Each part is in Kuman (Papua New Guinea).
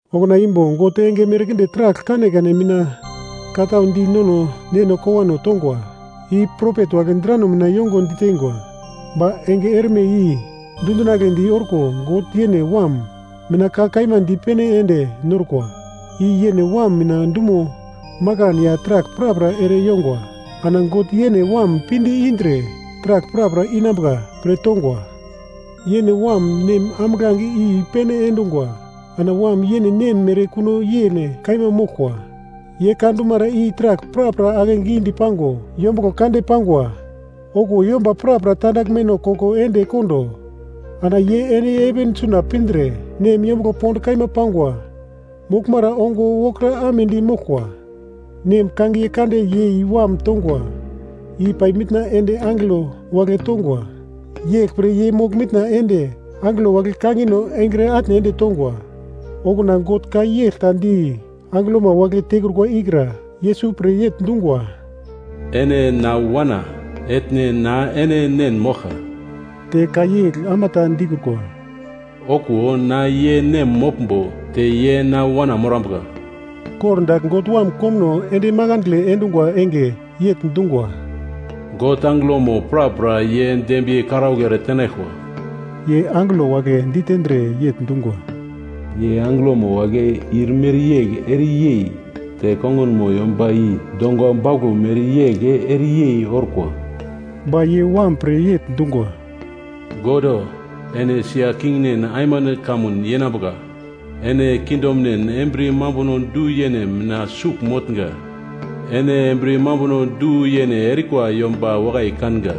Okuna imbo God enge merkinde taragl kanekane mina ka tau di nono neno kowano tongwa, i propet wagle drano mina yongo ditengwa. Ba enge erme i dundinagledi orko God yene Wam mina ka kaima dipene ende norkwa, i yene Wam mina dumo makan ya taragl prapra ere yongwa. Ana God yene Wam pinde indre taragl prapra inambuka pre tongwa. Yene Wam, Nem ambuglange i i-pene endungwa. Ana Wam yene Nem mere kuno yene kaima moglkwa, ye ka dumara i taragl prapra ake gidi pango yombuglo kande pangwa. Okuwo yomba prapra tandaglmeno koko ende kondo, ana ye ende heven suna pindre Nem yombuglo pond kaima pangwa moglmara ongo wokra amedi moglkwa. Nem kangiye kande yei Wam tongwa i pai mitna ende angelo wagle tongwa. Yeglpre, ye mogl mitna ende angelo wagle kangino engre atne ende tongwa. Okuna God ka yegl ta di angelomo wagle tekrukwa ikra Yesus pre yegl dungwa, “Ene na Wana, etne na ene Nen moglka.” Te ka yegl ama ta dikrukwa, “Okuwo na ye Nem moglmbo te ye na wana morambuka!” Kor dagl God Wam komuno ende makandle endungwa enge yegl dungwa, “God angelomo prapra ye dembiye karaugl ere tenaglkwa.” Ye angelo wagle ditendre yegl dungwa, “Ye angelomo wagle ir mereyegl ere yei, te kongunmo yomba i donga bauglo mereyegl ere yei orkwa.” Ba ye Wam pre yegl dungwa, “God O, ene sia kingnen aimande kamun yenambuka. Ene kingdomnen embriye mambuno du-yene mina sugl motnga. Ene embriye mambuno du-yene erikwa yomba wakai kanga.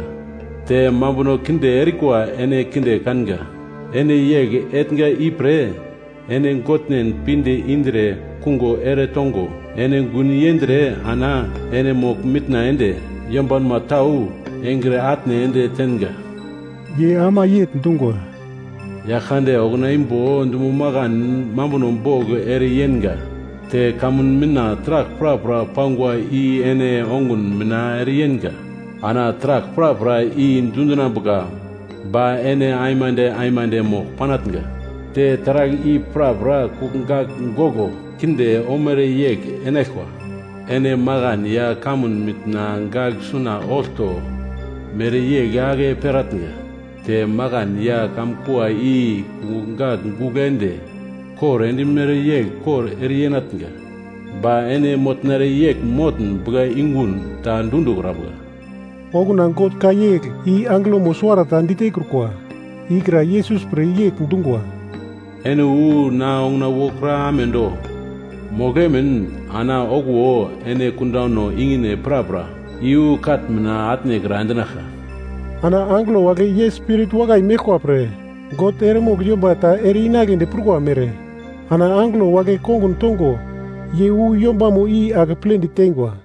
Te mambuno kinde erikwa ene kinde kanga. Ene yegl etnga ipre, ene Godnen, pinde indre kungo ere tongo ene gun yendre ana ene mogl-mitna ende yombanma tau engre atne ende tenga.” Ye ama yegl dungwa, “Yaglkande okuna imbo dumo makan mambuno bogl ere yenga te kamun mitna taragl prapra pangwa i ene ongun mina ere yenga. Ana taragl prapra i dundinambuka ba ene aimande aimande mogl panatnga, te taragl i prapra kungugl gagl goglo kinde omere yegl enaglkwa. Ene makan ya kamun mitna gagl suna olto mereyegl ake peratnga, te makan ya kamkua i kungugl gagl gugl ende kor endimere yegl kor ere yenatnga. Ba ene motnere yegl motn buglayungun ta dundikrambuka.” Okuna God ka yegl i angelomo suwarata ditekrukwa, ikra Yesus pre yegl dungwa, “Ene wu na onguna wokra amedo, mogl emin ana okuwo ene kundano ikine prapra i-wu katn mina atnekra endinaglka.” Ana angelo wagle ye spirit wakai meglkwa pre, God eremogl yomba ta ere-inagledi prukwa mere, ana angelo wagle kongun tongo ye wu yombamo i akeple diteingwa.